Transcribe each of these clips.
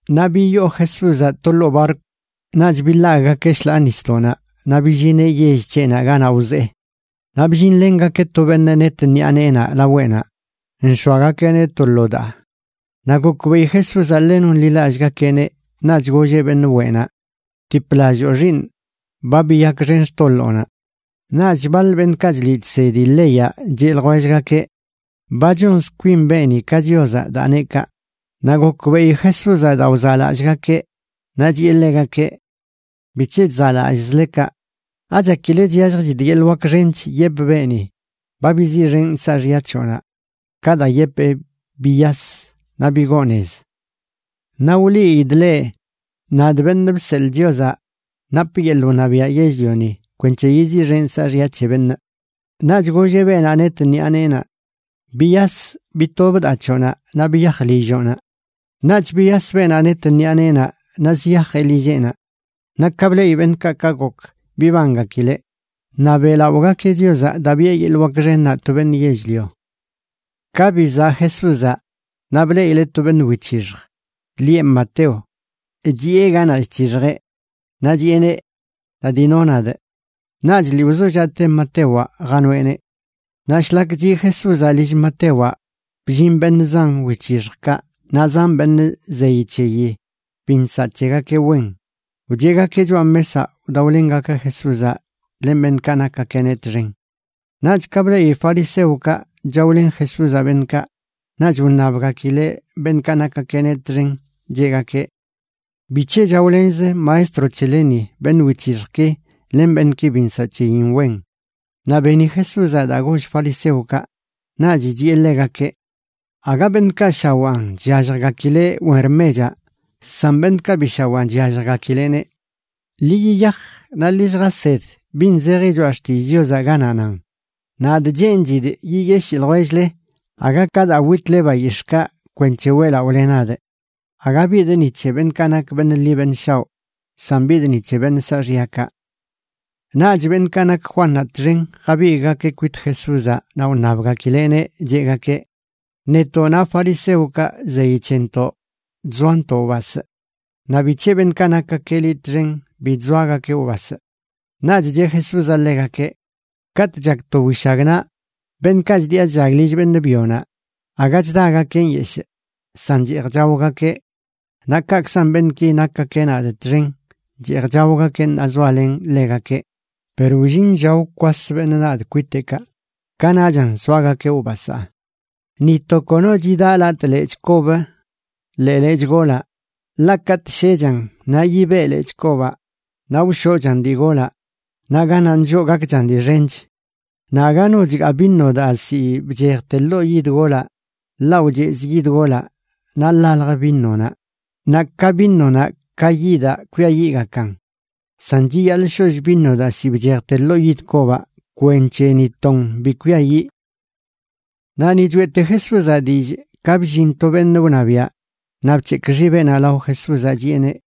Naꞌ biyoo Jesúzaꞌ to ḻoo barkw, naꞌch biḻagꞌgakeꞌ shḻaa nisdoꞌnaꞌ naꞌ billineꞌ yell c̱heꞌnaꞌ ganaꞌ wzee. Naꞌ bllinlengakeꞌ to beṉꞌ net ṉiꞌa neenaꞌ laweꞌnaꞌ, nx̱oagakeꞌneꞌ to lo daa. Naꞌ gokbeꞌi Jesúzaꞌ ḻe nonḻilallꞌgakeꞌneꞌ, naꞌch golleꞌ beṉꞌ weꞌnaꞌ: ―Btiplalloo, xiiṉꞌ, ba biyakxen xtoḻoonaꞌ. Naꞌch baḻ beṉꞌkaꞌ chliꞌ chsedi leyaꞌ cheꞌ ljwellgakeꞌ: “Ba chonz kwin beeni ka Chiozaꞌ daa neꞌ kaꞌ.” Naꞌ gokbeꞌi Jesúzaꞌ daa wzaꞌlallꞌgakeꞌ, naꞌ chiꞌe ḻegakeꞌ: ―¿Bic̱he chzaꞌlallꞌzle kaꞌ? ¿Achakile chyalljchidꞌ yeḻꞌ wak xench yepꞌ beeni: “Ba biziꞌxenꞌ saaxya c̱hoꞌnaꞌ”, ka daa yepee: “Biyas naꞌ bigoo nez”? Naꞌ wliidꞌ leꞌ, nadꞌ, Beṉꞌ Bseḻꞌ Chiozaꞌ, napꞌ yeḻꞌ wṉabiaꞌ yell-lioni kwenc̱he yiziꞌxenꞌ saaxya c̱he beṉꞌ. Naꞌch golleꞌ beenaꞌ net ṉiꞌa neenaꞌ: ―Biyas, bitob daa c̱hoꞌnaꞌ, naꞌ biyaj lilloꞌnaꞌ. Naꞌch biyas beenaꞌ net ṉiꞌa neenaꞌ naꞌ ziyajeꞌ lilleꞌnaꞌ. Naꞌ ka bleꞌi beṉꞌkaꞌ ka gok, bibangakileꞌ, naꞌ beꞌlaꞌogakeꞌ Chiozaꞌ daa biꞌe yeḻꞌ wak xennaꞌ to beṉꞌ yell-lio. Ka bizaꞌ Jesúzaꞌ naꞌ, bleꞌileꞌ to beṉꞌ wic̱hixj, lieꞌ Mateo, chiꞌe ganaꞌ chc̱hixjeꞌ. Naꞌ chiꞌeneꞌ: ―Da, dino nadꞌ. Naꞌch lii wzollaꞌte Matewaꞌ janoeꞌneꞌ. Naꞌ shlak chiꞌ Jesúzaꞌ lill Matewaꞌ, bllin beṉꞌ zan wic̱hixjkaꞌ naꞌ zan beṉꞌ zeyi c̱heyi bi nsaꞌ c̱hegakeꞌ wen, wcheꞌgakeꞌ choꞌa mesaꞌ wdaolengakeꞌ Jesúzaꞌ len beṉꞌkaꞌ nakgakeꞌneꞌ txen. Naꞌch ka bleꞌi fariseokaꞌ chaolen Jesúzaꞌ beṉꞌkaꞌ, naꞌch wṉabgakileꞌ beṉꞌkaꞌ nakgakeꞌneꞌ txen, cheꞌgakeꞌ: ―¿Bic̱he chaolenz maestro c̱heleni beṉꞌ wic̱hixjki len beṉꞌki bi nsaꞌ c̱heyin wen? Naꞌ beni Jesúzaꞌ daa goll fariseokaꞌ, naꞌch chiꞌe ḻegakeꞌ: ―Aga beṉꞌkaꞌ shawaan chyalljgakileꞌ wen rmechaꞌ san beṉꞌkaꞌ bi shawaan chyalljgakileꞌneꞌ. Ḻi yiyaj naꞌ ḻi lljased bin zeji Choꞌa Xtillꞌ Chiozaꞌ ganaꞌ nan: “Nadꞌ cheenchidꞌ yiyeshii ljwell-le, aga ka daa witle bayix̱ꞌkaꞌ kwenc̱he weꞌlaꞌole nadꞌ.” Aga bidꞌ ni c̱he beṉꞌkaꞌ nak beṉꞌ ḻi beṉꞌ shaoꞌ, san bidꞌ ni c̱he beṉꞌ saaxyakaꞌ. Naꞌch beṉꞌkaꞌ nak Juannaꞌ txen jabigꞌgakeꞌ kwit Jesúzaꞌ naꞌ wṉabgakileꞌneꞌ cheꞌgakeꞌ: ―Netoꞌ naꞌ fariseokaꞌ zeyi c̱hentoꞌ chzoantoꞌ wbasꞌ. Naꞌ ¿bic̱he beṉꞌkaꞌ nakgakeꞌ liꞌ txen bi chzoagakeꞌ wbasꞌ? Naꞌch cheꞌ Jesúzaꞌ ḻegakeꞌ: ―Katꞌ chak to wishagnaꞌ beṉꞌkaꞌ chdiꞌa chllag lill beṉꞌ byonaꞌ aga chdagakeꞌ nyeshꞌ, san cheej chaogakeꞌ. Naꞌ kaꞌkzan beṉꞌki nakgakeꞌ nadꞌ txen, cheej chaogakeꞌ ṉaa zoalenꞌ ḻegakeꞌ, per wllin lla wkwas beṉꞌ nadꞌ kwiteꞌkaꞌ, kanaꞌchan soagakeꞌ wbasaa. ’Ni to kono chidaꞌ latꞌ lechꞌ kob ḻee lechꞌ golaꞌ, ḻaꞌ katꞌ shechan naꞌ yibeꞌ lechꞌ kobaꞌ naꞌ wshoꞌchan dii golaꞌ naꞌ ganaꞌ nlloꞌ gakchan dii xench. Naꞌ aga no chgaa vino daa ziꞌ bchejte ḻoo yid golaꞌ, ḻaꞌ wchezꞌ yid golaꞌ naꞌ ḻaljə vinonaꞌ, naꞌ ka vinonaꞌ ka yidaꞌ kwiayiꞌgakan. San chiyaḻꞌ sholl vino daa ziꞌ bchejte ḻoo yid kobaꞌ kwenc̱he ni ton bi kwiayiꞌ. Naꞌ ni choeꞌte Jesúzaꞌ dillꞌ, ka bllin to beṉꞌ wṉabiaꞌ naꞌ bc̱hekꞌ xibeꞌnaꞌ lao Jesúzaꞌ, chiꞌeneꞌ: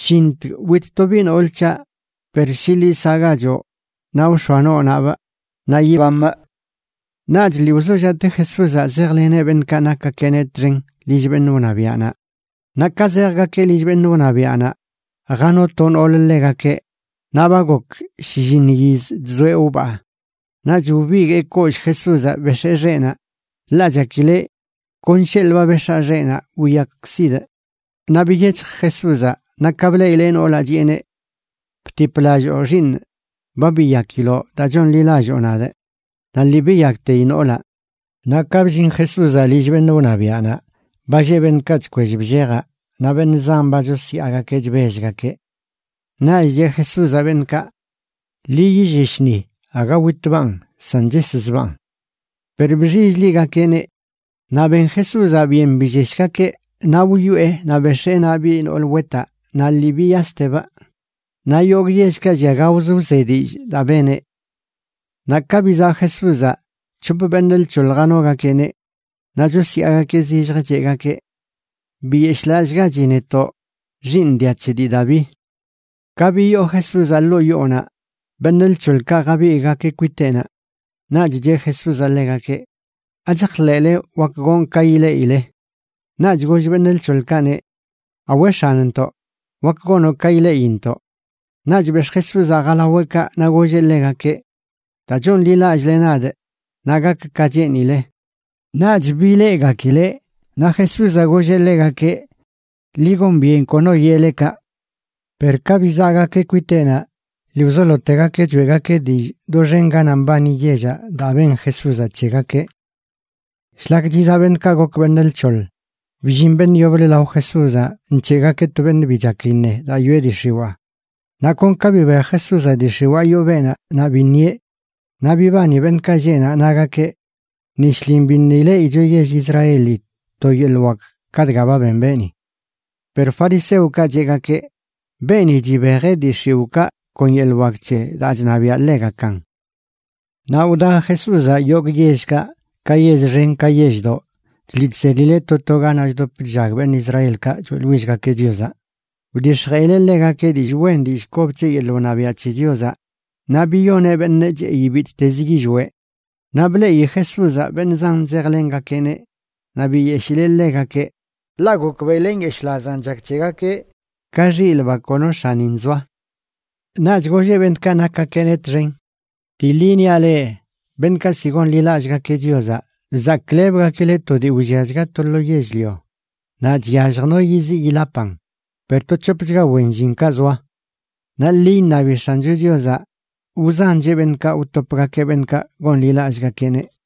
―Shintg wit to biꞌ nool c̱haꞌ; per shi liꞌ saꞌgachoꞌ naꞌ wx̱oa noonaꞌbꞌ naꞌ yibamꞌ. Naꞌch lii wzollaꞌte Jesúzaꞌ zejleneꞌ beṉꞌkaꞌ nakgakeꞌneꞌ txen lill beṉꞌ wṉabiaꞌnaꞌ. Naꞌ ka zejgakeꞌ lill beṉꞌ wṉabiaꞌnaꞌ jano to noolə ḻegakeꞌ, naꞌ ba gok shlliṉ yiz chzoeꞌ wbaa. Naꞌch wbiguee kollꞌ Jesúzaꞌ bex̱ee xeꞌnaꞌ, ḻaꞌ chakileꞌ: “Kon sheḻꞌ ba bex̱aa xeꞌnaꞌ wiyakkzidꞌ.” Naꞌ biyec̱hj Jesúzaꞌ naꞌ ka bleꞌileꞌ noolaꞌ chiꞌeneꞌ: ―Btiplalloo, xiiṉꞌ, ba biyakiloꞌ daa chonḻilalloo nadꞌ. Naꞌ lii biyakteyi noolaꞌ. Naꞌ ka bllin Jesúzaꞌ lill beṉꞌ wṉabiaꞌnaꞌ ba lleꞌ beṉꞌkaꞌ chkwell bllejaꞌ naꞌ beṉꞌ zan ba chosyaagakeꞌ chbellgakeꞌ. Naꞌch cheꞌ Jesúzaꞌ beṉꞌkaꞌ: ―Ḻi yillesh ni. Aga witbaꞌn san cheszbaan. Per bxill-ligakeꞌneꞌ. Naꞌ ben Jesúzaꞌ byen billeshgakeꞌ, naꞌ wyoꞌe naꞌ bex̱ee naꞌ biꞌ nool wetaꞌ naꞌ lii biyastebꞌ. Naꞌ yogꞌ yellkaꞌ llia gaoz wze dillꞌ daa beneꞌ. Naꞌ ka bizaꞌ Jesúzaꞌ, c̱hop beṉꞌ lc̱hoḻ janogakeꞌneꞌ. Naꞌ chosyaagakeꞌ zilljə cheꞌgakeꞌ: ―¡Biyeshꞌlallꞌgachi netoꞌ, xiiṉ dia c̱he dii Daví! Ka biyoo Jesúzaꞌ ḻoo yoonaꞌ, beṉꞌ lc̱hoḻkaꞌ jabigꞌgakeꞌ kwiteꞌnaꞌ. Naꞌch cheꞌ Jesúzaꞌ ḻegakeꞌ: ―¿Achajḻeꞌle wak gonꞌ ka ileꞌile? Naꞌch goll beṉꞌ lc̱hoḻkaꞌneꞌ: ―Awe, X̱anntoꞌ, wak gonoꞌ ka ileꞌintoꞌ. Naꞌch bex̱ꞌ Jesúzaꞌ jalaweꞌkaꞌ naꞌ golleꞌ ḻegakeꞌ: ―Daa chonḻilallꞌle nadꞌ naꞌ gak ka cheenile. Naꞌch bileꞌgakileꞌ. Naꞌ Jesúzaꞌ golleꞌ ḻegakeꞌ: ―Ḻi gon byen kono yeꞌle kaꞌ. Per ka bizaꞌgakeꞌ kwiteꞌnaꞌ lii wzolotegakeꞌ choeꞌgakeꞌ dillꞌ doxen ganaꞌ mbani yellaꞌ daa ben Jesúzaꞌ c̱hegakeꞌ. Shlak chizaꞌ beṉꞌkaꞌ gok beṉꞌ lc̱hoḻ, bllin beṉꞌ yoblə lao Jesúzaꞌ nc̱heꞌgakeꞌ to beṉꞌ bi chak iṉe daa yoꞌe dii x̱iwaa. Naꞌ kon ka bibej Jesúzaꞌ dii x̱iwaa yoo beenaꞌ naꞌ biṉieꞌ. Naꞌ bibani beṉꞌkaꞌ lleꞌ naꞌ, nagakeꞌ: ―Ni shlin biṉꞌ ileꞌicho yell Israeli to yeḻꞌ wak ka dga ba ben beeni. Per fariseokaꞌ cheꞌgakeꞌ: ―Beeni chibejeꞌ dii x̱iwꞌkaꞌ kon yeḻꞌ wak c̱he daa chṉabiaꞌ ḻegakan. Naꞌ wda Jesúzaꞌ yogꞌ yellkaꞌ, ka yell xen ka yelldoꞌ, chliꞌ chsedileꞌ to to ganaꞌ chdop chllag beṉꞌ Israelkaꞌ choeꞌḻwillgakeꞌ Chiozaꞌ. Wdix̱jeꞌileꞌ ḻegakeꞌ dillꞌ wen dillꞌ kob c̱he yeḻꞌ wṉabiaꞌ c̱he Chiozaꞌ naꞌ biyoneꞌ beṉꞌ cheꞌi bittezə yillweꞌ. Naꞌ bleꞌi Jesúzaꞌ beṉꞌ zan zejlengakeꞌneꞌ naꞌ biyeshileꞌ ḻegakeꞌ, ḻaꞌ gokbeꞌileꞌ ka nyeshꞌlazan chak c̱hegakeꞌ, ka xilꞌ ba kono x̱anin zoa. Naꞌch golleꞌ beṉꞌkaꞌ nakgakeꞌneꞌ txen: ―Dii ḻi niaꞌ leꞌ, beṉꞌkaꞌ ziꞌ gonḻilallꞌgakeꞌ Chiozaꞌ zaklebgakileꞌ to dii wlliachga to lo yell-lio, naꞌ chyallj no yiziꞌ yilapan, per to c̱hopchga wen llinkaꞌ zoa. Naꞌ ḻi iṉabi X̱ancho Chiozaꞌ wzancheꞌ beṉꞌkaꞌ wtopgakeꞌ beṉꞌkaꞌ gonḻilallꞌgakeꞌneꞌ.